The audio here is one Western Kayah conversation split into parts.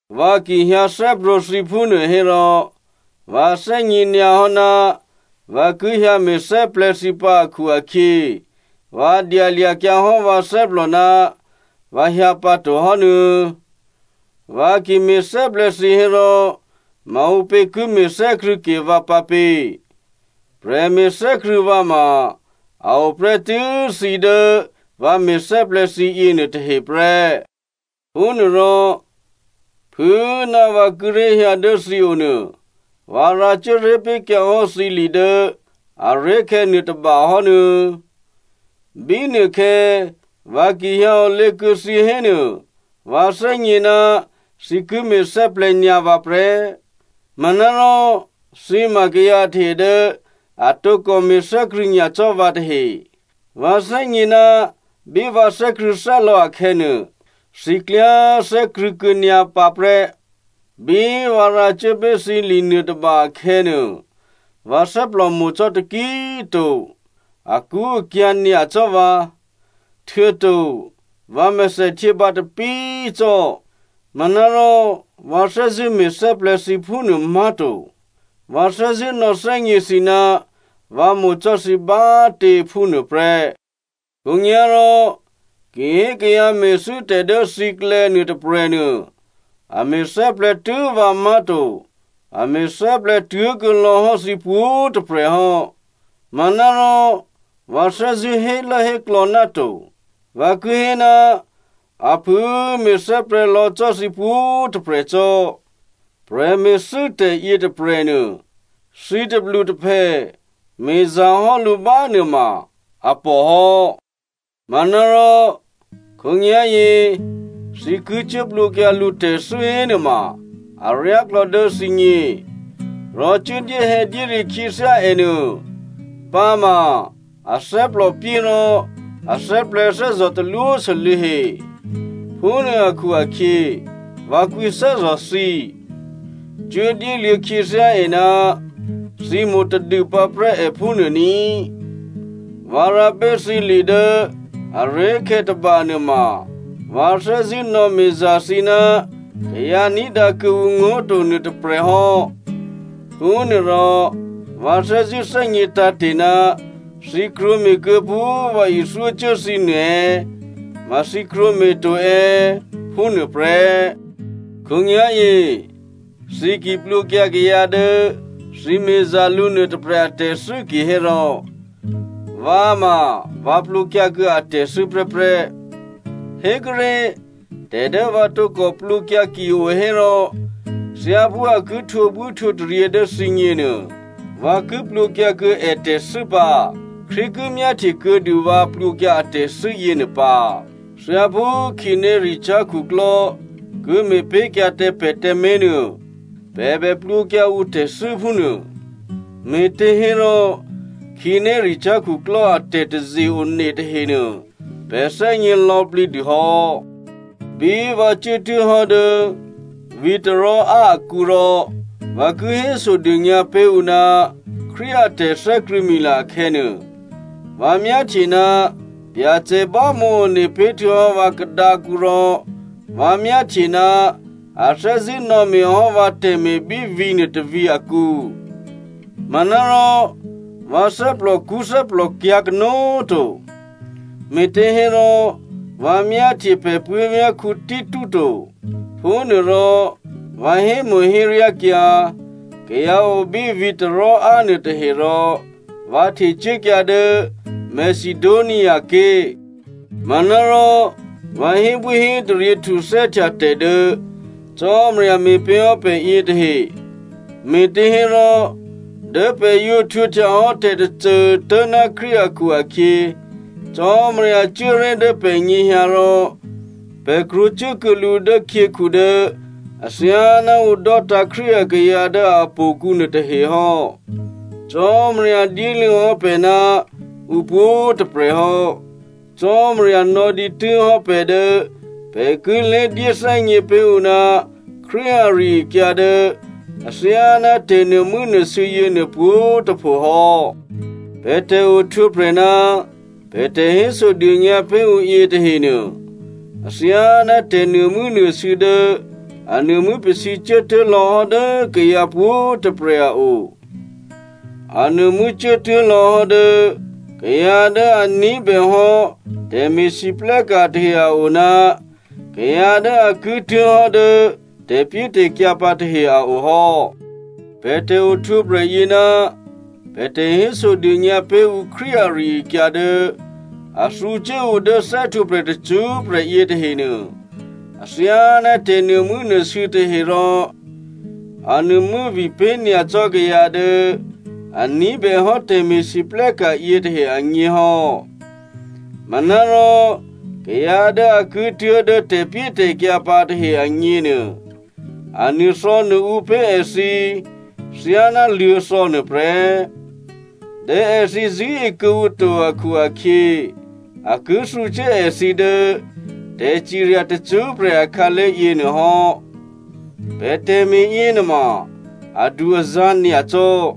Vǎ ki hyǎ thè́prwǒ̤ thǐ phúnuô hérò, vǎ thè́gně nyǎ hò́ ná vǎ ki hyǎ me̤thè́plè̤̌ thǐ pǎ akhu-akhyě vǎ dyalya̤kyǎ hò́ vǎ thè́plò ná vǎ hyǎ pǎto hò́nuô̌. Vǎ ki me̤thè́plè̤̌ thǐ hérò maǔpě ki me̤thè́krṳ̂̌ke vǎ pǎ pě? Prè̤me̤thè́krṳ̂̌ vǎ ma a o prè́tû́ thǐ dố vǎ me̤thè́plè̤̌ thǐ yěnuôtahe prè́. Phúnuôrò, phû꤮ ná vǎ kíré̤ hyǎ dố thǐ o nuô, vǎ rǎcuố ré̤ pé̤kyǎ hò́ thǐ li dố aré̤khè̌ nuôtôba hò́ nuô̌꤮. Bínuôkhè̌ vǎ ki hyǎ olě kuô̌ thǐ hénuô, vǎ thè́gně ná thǐ ki me̤thè́plè̤̌ nyǎ vǎ prè́. Manárò thǐ ma kayǎ tahe dố a tǒkò me̤thè́krṳ̂̌ nyacò́ vǎ tahe. Vǎ thè́gně ná bí vǎ thè́krṳ̂̌thè́lò̌ akhè̌nuô, thǐ klyá꤮ thè́krṳ̂̌ kuô̌nyǎ pǎ prè́. Bí vǎ rǎcuố pé̤ thǐ li nuôtôba akhè̌nuô, vǎ thè́plòmo̤ cò́ taki꤮ to, akṳ́akyǎ̤ nyacò́ vǎ. Htuô̌to vǎ mèthèhtyě bǎtapí꤮ cò́. Manárò vǎ thè́zṳ̂́ me̤thè́plè̤̌ thǐ phúnuô má̤to, vǎ thè́zṳ̂́ nò̌thè́gně thǐ ná vǎ mo̤ cò́ thǐ bá꤮ tě phúnuôprè́. Khǒnyá̤rò, ki hé kayǎ me̤thû́tè̤ dố thǐklè̌ nuôtôprè̤ nuô, a me̤thè́plè̤̌ tû́ vǎ má̤to, a me̤thè́plè̤̌ tuố̤kuô̌ lò̌hò́ thǐ pwǒ̤꤮ tôprè̤ hò́. Manárò vǎ thè́zṳ̂́ hélốhéklò̌ náto, vǎ ki hé ná a phû꤮ me̤thè́plè̤̌ lò̌ cò́ thǐ pwǒ̤꤮ tôprè̤ cò́. Prè̤me̤thû́tè̤ yětôprè̤nuô, thǐ tôplutôphè me̤za̤hò́ lǔ bánuôma a pòhò́. Manárò, khǒnyá̤yě thǐ ki cuố plwǒkyǎ lǔ tè̤thû́ hénuôma aryáklò̌ dố thǐgně. Rò cuố dyéhè̌dyére khyěthyá è nuô. Pǎma a thè́plòpyé rò a thè́plè̤̌thè́zò̤ talwósû́lû̌ he. Phúnuô akhu-akhyě, vǎ kwǐthè́zò̤ thǐ. Cuố dyéluô̌ khyěthyá è ná thǐ mo̤tadû pǎprè́ è phúnuô ní꤮. Vǎ rǎ pé̤ thǐ li dố aré̤khè̌ tôbanuô ma, vǎ thè́zṳ̂́ nò̌me̤za̤ thǐ ná kayǎ ní̤dǎ kuô̌ǔ ngó̤ to nuôtôprè̤ hò́. Phúnuôrò vǎ thè́zṳ̂́ thè́gně tǎ̤te̤ ná thǐ krwǒme̤kuô̌ phú vǎ ithyócuố thǐ nuô è̌, ma thǐ krwǒme̤ to è̌ phúnuôprè́. Khǒnyá̤yě thǐ ki plwǒkyǎ kayǎ dố thǐ me̤za̤ lǔ nuôtôprè̤ atè̤thû́ kihérò vǎ꤮ ma vǎ plwǒkyǎ kuô̌ ètè̤thû́ prè́prè́. Hékuốré̤, tè̤ dố vǎ tǒkò plwǒkyǎ ki o hérò, thyáphú a ki htwǒbwíhtwǒtaryě dố thǐgněnuô vǎ ki plwǒkyǎ kuô̌ ètè̤thû́ pǎ. Krístu ki myáhtye kuô̌dû vǎ plwǒkyǎ atè̤thû́ yěnuô pǎ. Thyáphú khǐnéricyá̤ khuklò́ ki me̤pé̤kyǎ tǎ pè̤ tǎmé̤nuô, pè̤ bè plwǒkyǎ ǔ tè̤thû́ phúnuô. Me̤těhérò khǐnéricyá̤ khuklò́ a tè̤taze-one tahenuô pè̤ thè́gně lò̌plǐ dû hò́. Bí vǎ cuốtuố̤ hò́ dố vǐ̤ Troa akǔ rò vǎ ki hésodônyǎ pé̤ ǔ ná Krístu a tè̤thè́krṳ̂̌mila akhè̌nuô, vǎ myáhtye ná Byacè bámǒ one pé̤ htuô̌hò́ vǎ kadǎkǔ rò vǎ myáhtye ná a thè́zṳ̂́ nò̌me̤ hò́ vǎ tè̤me̤ bí vǐ̤ nuôtôvǐ̤ akǔ. Manárò vǎ thè́plòkṳ́ thè́plòkyǎ̤ kanó̤꤮ to, me̤těhérò vǎ myáhtye pè̤ puố̤vyá̤ Tito to. Phúnuôrò vǎ hémo̤héryákyǎ kayǎ o bí vǐ̤ Troa nuôtahe rò vǎ htecuốkyǎ dố Macedonia ké̤. Manárò, vǎ hébwíhétaryě htuthè́htya tè̤ dố Cò́marya me̤pé̤ hò́ pè̤ yětahe, me̤těhérò dố pè̤ yǒ htwǒhtyahò́ tè̤tôcô tố̤ná Krístu akhu-akhyě, Cò́marya cuố ré̤ dố pè̤nyěhyǎ rò pè̤ krwǒcuốkuô̌ lǔ dố khyěkhu dố athyáná ǔ dò́tǎ̤ Krístu akayǎ dố htò̌kǔ nuôtahe hò́. Cò́marya dyéluô̌ hò́ pè̤ ná ǔ pwǒ̤꤮ tôprè̤ hò́. Cò́marya nò̌dǐtû́ hò́ pè̤ dố pè̤ ki lědyéthè́gně pé̤ ǔ ná Krístu ari-akyǎ dố athyáná tè̤nuô̤mû́nuô̤sû̌ yěnuô pwǒ̤꤮ tôpho hò́. Pè̤ tè̤ohtwǒprè̤ ná pè̤ tè̤hésodônyǎ pé̤ ǔ yětahenuô athyáná tè̤nuô̤mû́nuô̤sû̌ dố a nuô̤mû́ pasǐ cuốtuố̤ lò̌hò́ dố kayǎ pwǒ̤꤮ tôprè̤ a o. A nuô̤mû́ cuốtuố̤ lò̌hò́ dố kayǎ dố a ní̤bèhò́ tè̤me̤lwóhteka̤ tahe a o ná kayǎ dố a ki tuố̤ hò́ dố tè̤pyétè̤kyǎ pǎ tahe a o hò́. Pè̤ tè̤ohtwǒprè̤ yě ná pè̤ tè̤hésodônyǎ pé̤ ǔ Krístu ari-akyǎ dố a thǔcuố ǔ dố thè́htwǒprè̤ tacṳ́prè̤ yětahenuô, athyáná tè̤nuô̤mû́nuô̤sû̌ tahe rò a nuô̤mû́vi pé̤nyacò́ kayǎ dố a ní̤bèhò́ tè̤me̤lwóhteka̤ yětahe agně hò́. Manárò kayǎ dố a ki tuố̤dố tè̤pyétè̤kyǎ pǎ tahe agněnuô, a nuô̤thò̌nuô̤ǔ pé̤ èthǐ thyáná luô̤̌thò̌ nuôprè́. Dố èthǐ zṳ̂́e kuô̌ǔ to akhu-akhyě, a ki thǔcuố èthǐ dố tè̤cirya tacṳ́prè̤ akhǎlé̤ yěnuô hò́. Pè̤ tè̤me̤ yěnuôma adu-azǎ̤ nyacò́,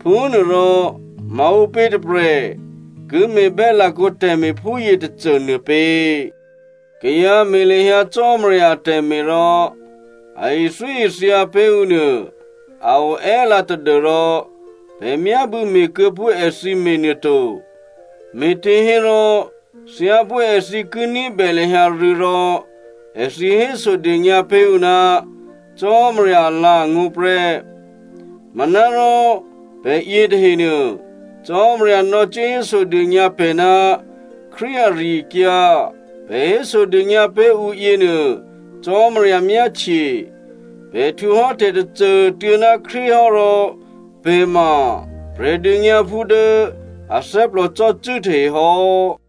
phúnuôrò maǔpě tôprè̤ ki me̤bè́ lakǒ tè̤me̤ phúyě tôcô nuô pě? Kayǎ me̤ lahyǎ Cò́marya atè̤me̤ rò a ithyóithya pé̤ ǔ nuô a o è́lǎ tadû́rò pè̤ myábû̌ me̤kuô̌ phú èthǐ me̤nuô to. Me̤těhérò, thyáphú èthǐ ki ní̤bè lahyǎ rû̌ rò èthǐ hésodônyǎ pé̤ ǔ ná Cò́marya alǎ̤angó̤ prè́. Manárò pè̤ yětahenuô, Cò́marya nò̌cuố hésodônyǎ pè̤ ná Krístu ari-akyǎ, pè̤ hésodônyǎ pé̤ ǔ yěnuô Cò́marya myáhtye, pè̤ htwǒhò́ tè̤tôcô꤮ tuô̌ ná Krístu hò́ rò pè̤ ma Prè̤dônyǎphú dố a thè́plòcò́cû́ tahe hò́.